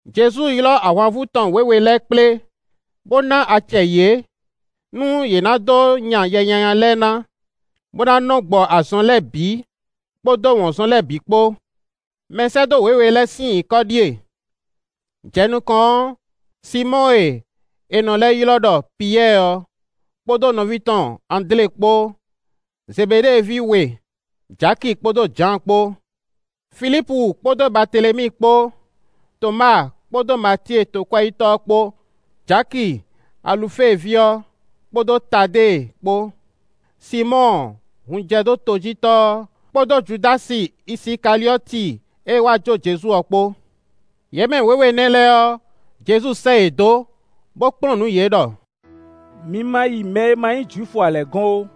Jezu ylɔ́ ahwanvú tɔn wěwe lɛ́ɛ kplé, bó ná acɛ yě, nú yě ná dó nya yɛ nyanya lɛ́ɛ ná, bó ná nɔ́ gbɔ azɔn lɛ́ɛ bǐ, kpódó wɔ̌nzɔn lɛ́ɛ bǐ kpó. Mɛsɛ́dó wěwe lɛ́ɛ sín nyǐkɔ ɖíe: jɛ nukɔn ɔ́, Sinmɔ́ɔ e è nɔ lɛ́ ylɔ́ ɖɔ Piyɛ́ɛ ɔ́, kpódó nɔví tɔn Andlé kpó; Zebeɖée ví we, Jaki kpódó Jǎan kpó. Filípu kpódó Baatelemíi kpó; Tɔmáa kpódó Matíe tokwɛ́yítɔ́ ɔ́ kpó; Jaki Alufée ví ɔ́, kpódó Tadée kpó; Sinmɔ́ɔ hunjɛdótojítɔ́ ɔ́, kpódó Judási Isikaliɔ́ti e wá jó Jezu ɔ́ kpó. Yě mɛ wěwe nɛ́ lɛ́ɛ ɔ́, Jezu sɛ́ yě dó, bó kplɔ́n nǔ yě ɖɔ: “Mi ma yi mɛ e ma nyí Jwifu ǎ lɛ́ɛ gɔ́n ó,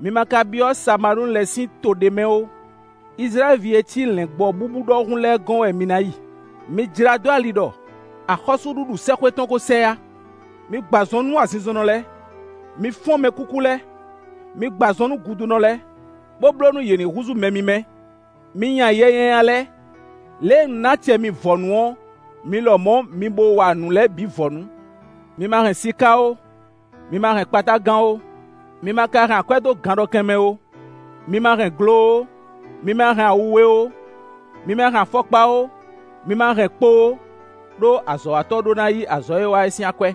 mi ma ka byɔ́ Samalíinu lɛ́ɛ sín to ɖé mɛ ó. Izlayɛ́li ví e cí lɛ̌ngbɔ́ búbú ɖɔhun lɛ́ɛ gɔ́n wɛ mi ná yi. Mi jlá dó ali ɖɔ: ‘Axɔ́súɖuɖu sɛ́xwé tɔn ko sɛ yá.’ Mi gbɔ azɔn nú azinzɔnnɔ lɛ́ɛ; mi fɔ́n mɛkúkú lɛ́ɛ; mi gbɔ azɔn nú gudunɔ lɛ́ɛ, bó bló nú yě ní húzú mɛ mímɛ́; mi nya yɛ nyanya lɛ́ɛ. Lě e un ná acɛ mi vɔ̌nu ɔ́, mi lɔmɔ̌ mi bo wa nǔ lɛ́ɛ bǐ vɔ̌nu. Mi ma hɛn siká ó, mi ma hɛn kpatágan ó, mi ma ka hɛn akwɛ́ dó ganɖɔkɛn mɛ ó; mi ma hɛn glo ó, mi ma hɛn awu we ó; mi ma hɛn afɔkpa ó, mi ma hɛn kpo ó; ɖó azɔ̌watɔ́ ɖó ná yí azɔ̌ e é wa ɔ́ sín akwɛ́.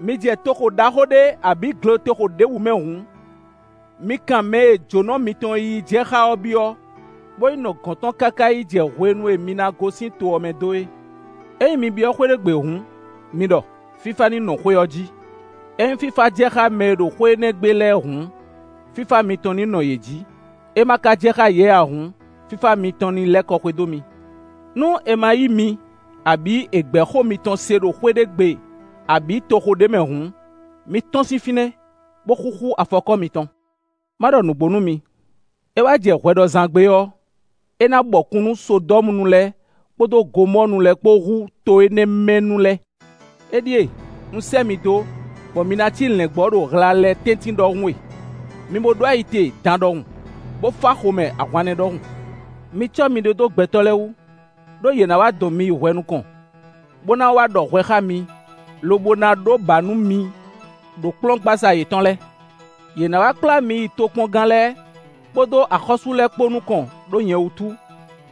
“Mi jɛ toxo ɖaxó ɖé abǐ gletoxo ɖěbǔ mɛ hǔn, mi kan mɛ e jǒnɔ mitɔn yíyí jɛ xá ɔ́ byɔ́, bó yi nɔ gɔ̌n tɔn káká yi jɛ hwenu e mi ná gosín to ɔ́ mɛ dó é. Ényí mi byɔ́ xwé ɖé gbe hǔn, mi ɖɔ: ‘Fífá ní nɔ xwé ɔ́ jí.’ Ényí fífá jɛ xá mɛ e ɖo xwé énɛ́ gbe lɛ́ɛ hǔn, fífá mitɔn ní nɔ yě jí; é ma ka jɛ xá yě ǎ hǔn, fífá mitɔn ní lɛ́ kɔ xwedó mi. Nú è ma yí mi, abǐ è gbɛ̌ xó mitɔn se ɖo xwé ɖé gbe, abǐ toxo ɖé mɛ hǔn, mi tɔ́n sín fínɛ́, bó xúxú afɔkɔ́ mitɔn. Má ɖɔ nǔgbó nú mi: é wá jɛ hwɛɖɔzán gbe ɔ́, é ná bɔkun nú Sodɔ́munu lɛ́ɛ kpódó Gomɔ́ɔnu lɛ́ɛ kpó hú to énɛ́ mɛ nu lɛ́ɛ.” “Éɖíe, un sɛ́ mi dó, bɔ mi ná cí lɛ̌ngbɔ́ ɖo hla lɛ́ɛ tɛ́ntin ɖɔhun e; mi bo ɖó ayi te dan ɖɔhun, bó fá xomɛ ahwannɛ́ ɖɔhun. Mi cɔ́ miɖée dó gbɛtɔ́ lɛ́ɛ wú, ɖó yě ná wá dɔn mi yi hwɛ nukɔn, bo na wá ɖɔ hwɛ xá mi, lobo ná ɖó bǎ nú mi ɖo kplɔ́ngbasá yětɔn lɛ́ɛ. Yě ná wá kplá mi yi tokpɔngán lɛ́ɛ kpódó axɔ́sú lɛ́ɛ kpó nukɔn ɖó nyɛ wútu,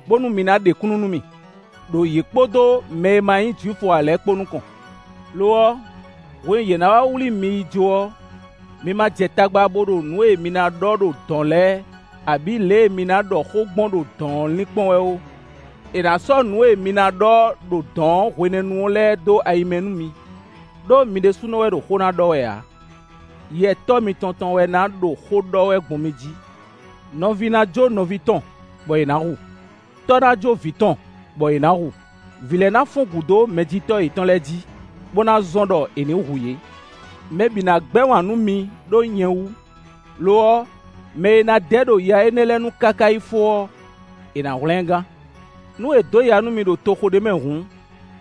bónú mi ná ɖe kúnnu nú mì, ɖo yě kpódó mɛ e ma nyí Jwifu ǎ lɛ́ɛ kpó nukɔn. Lo ɔ́, hwenu e yě ná wá wlí mi yi jó ɔ́, mi ma jɛ tagba bo ɖo nǔ e mi ná ɖɔ ɖo dɔ̌n lɛ́ɛ, abǐ lě e mi ná ɖɔ xó gbɔn ɖo dɔ̌n ɔ́ linkpɔ́n wɛ ó, è nǎ sɔ́ nǔ e mi ná ɖɔ ɖo dɔ̌n hwenɛ́nu lɛ́ɛ dó ayi mɛ nú mi. Ɖó mi ɖésúnɔ wɛ ɖo xó ná ɖɔ wɛ ǎ; Yɛ Tɔ́ mitɔn tɔn wɛ ná ɖo xó ɖɔ wɛ gbɔn mi jí. “Nɔví ná jó nɔví tɔn, bɔ è nǎ hu; tɔ́ ná jó vǐ tɔn, bɔ è nǎ hu; vǐ lɛ́ɛ ná fɔ́n gǔ dó mɛjitɔ́ yětɔn lɛ́ɛ jí, bó ná zɔ́n ɖɔ è ní hu yě. Mɛ bǐ ná gbɛ́ wǎn nú mi ɖó nyɛ wú. Lo ɔ́, mɛ e ná dɛ ɖo ya énɛ́ lɛ́ɛ nu káká yi fó ɔ́, è nǎ hwlɛ́n ɛ gán. Nú è dǒ ya nú mi ɖo toxo ɖé mɛ hǔn,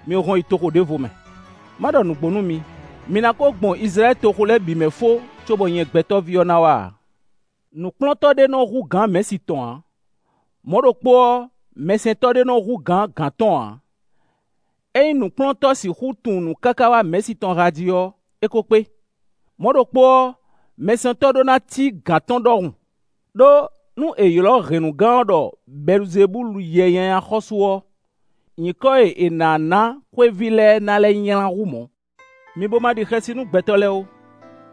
mi hɔn yi toxo ɖěvo mɛ. Má ɖɔ nǔgbó nú mi: mi ná ko gbɔn Izlayɛ́li toxo lɛ́ɛ bǐ mɛ fó, cóbɔ nyɛ Gbɛtɔ́ví ɔ́ ná wá ǎ. “Nǔkplɔ́ntɔ́ ɖé nɔ́ hú gǎn mɛ̌si tɔn ǎ; mɔ̌ ɖokpó ɔ́, mɛsɛntɔ́ ɖé nɔ́ hú gǎn gǎn tɔn ǎ; ényí nǔkplɔ́ntɔ́ sixú tunwun nǔ káká wá mɛ̌si tɔn há jí ɔ́, é ko kpé. Mɔ̌ ɖokpó ɔ́, mɛsɛntɔ́ ɖó ná cí gǎn tɔn ɖɔhun; ɖó, nú è ylɔ́ hɛ̌nnugán ɔ́ ɖɔ Bɛluzebúlu yɛ nyanya xɔ́sú ɔ́, nyǐkɔ e è nǎ ná xwéví lɛ́ɛ ná lɛ́ nylá hú mɔ̌. “Mi bo ma ɖi xɛsi nú gbɛtɔ́ lɛ́ɛ ó;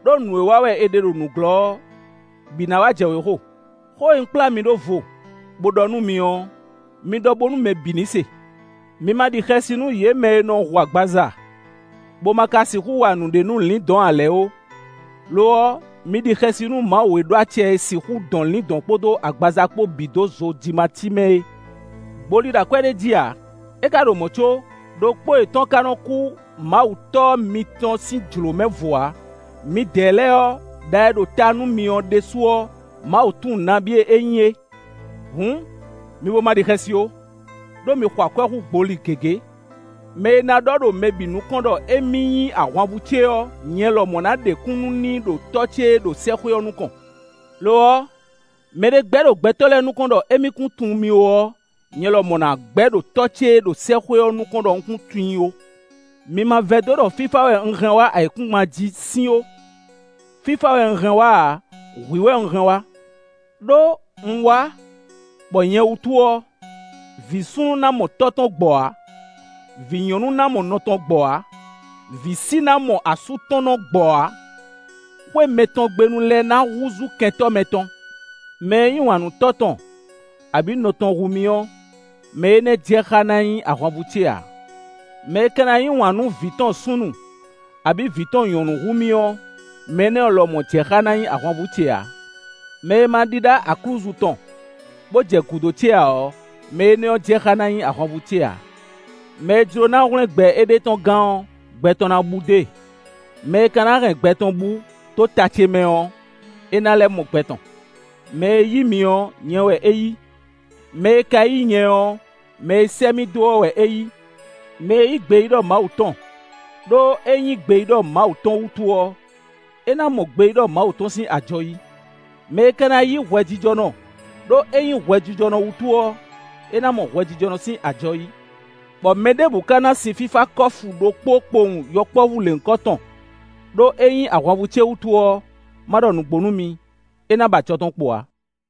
ɖó nǔ e wa wɛ è ɖe ɖo nǔglɔ́ ɔ́, bǐ ná wá jɛ wěxo. Xó e un kplá mi ɖó vo, bó ɖɔ nú mi ɔ́, mi ɖɔ bónú mɛ bǐ ní se. Mi ma ɖi xɛsi nú yě mɛ e nɔ hu agbaza, bó ma ka sixú wa nǔɖé nú lǐndɔ̌n ǎ lɛ́ɛ ó; lo ɔ́, mi ɖi xɛsi nú Mawu e ɖó acɛ e sixú dɔn lǐndɔ̌n kpódó agbaza kpó bǐ dó zojimací mɛ é. Gboli ɖo akwɛ́ ɖé jí ǎ; é ka ɖo mɔ̌ có, ɖokpó yětɔn ka nɔ́ kú Mawu Tɔ́ mitɔn sín jlǒ mɛ vo ǎ. Midɛɛ lɛ́ɛ ɔ́, ɖa e ɖo ta nú mi ɔ́ ɖésú ɔ́, Mawu tunwun nabí e é nyí é. Hǔn, mi bo ma ɖi xɛsi ó, ɖó mi xɔ akwɛ́ hú gboli gěgé. “Mɛ e ná ɖɔ ɖo mɛ bǐ nukɔn ɖɔ émí nyí ahwanvú ce ɔ́, nyɛ lɔmɔ̌ ná ɖe kúnnu n'i ɖo Tɔ́ ce e ɖo sɛ́xwé ɔ́ nukɔn. Lo ɔ́, mɛɖé gbɛ́ ɖo gbɛtɔ́ lɛ́ɛ nukɔn ɖɔ émí kún tunwun mì ó ɔ́, nyɛ lɔmɔ̌ na gbɛ́ ɖo Tɔ́ ce e ɖo sɛ́xwé ɔ́ nukɔn ɖɔ un kún tunwun i ó. “Mi ma vɛdó ɖɔ fífá wɛ un hɛn wá ayǐkúngban jí sín ó; fífá wɛ un hɛn wá ǎ; hwǐ wɛ un hɛn wá. Ɖó un wá bɔ nyɛ wútu ɔ́, vǐ súnnu ná mɔ tɔ́ tɔn gbɔ ǎ; vǐ nyɔ̌nu ná mɔ nɔ tɔn gbɔ ǎ; vǐsi ná mɔ asú tɔn nɔ gbɔ ǎ. Xwé mɛtɔn gbe nu lɛ́ɛ na húzú kɛntɔ́ mɛtɔn. “Mɛ e yí wǎn nú tɔ́ tɔn abǐ nɔ tɔn hú mì ɔ́, mɛ énɛ́ jɛ xá ná nyí ahwanvú ce ǎ; mɛ e ka ná yí wǎn nú vǐ tɔn súnnu abǐ vǐ tɔn nyɔ̌nu hú mì ɔ́, mɛ énɛ́ lɔmɔ̌ jɛ xá na nyí ahwanvú ce ǎ. Mɛ e ma ɖíɖá aklúzu tɔn, bó jɛ gǔdo ce ǎ ɔ́, mɛ énɛ́ jɛ xá ná nyí ahwanvú ce ǎ. Mɛ e jló ná hwlɛ́n gbɛ éɖée tɔn gán ɔ́, gbɛ tɔn ná bú dó e; mɛ e ka ná hɛn gbɛ tɔn bú dó ta ce mɛ ɔ́, é ná lɛ́ mɔ gbɛ tɔn. “Mɛ e yí mi ɔ́, nyɛ wɛ é yí; mɛ e ka yí nyɛ ɔ́, mɛ e sɛ́ mì dó ɔ́ wɛ é yí. Mɛ e yí gbeyíɖɔ Mawu tɔn, ɖó é nyí gbeyíɖɔ Mawu tɔn wútu ɔ́, é ná mɔ gbeyíɖɔ Mawu tɔn sín ajɔ yí. Mɛ e ka na yí hwɛjijɔnɔ, ɖó é nyí hwɛjijɔnɔ wútu ɔ́, é ná mɔ hwɛjijɔnɔ sín ajɔ yí. Bɔ mɛ ɖěbǔ ka ná sin fífá kɔ́fu ɖokpó kpowun yɔkpɔ́vú lěhunkɔtɔn, ɖó é nyí ahwanvú ce wútu ɔ́, má ɖɔ nǔgbó nú mi, é ná ba ajɔ tɔn kpo ǎ.”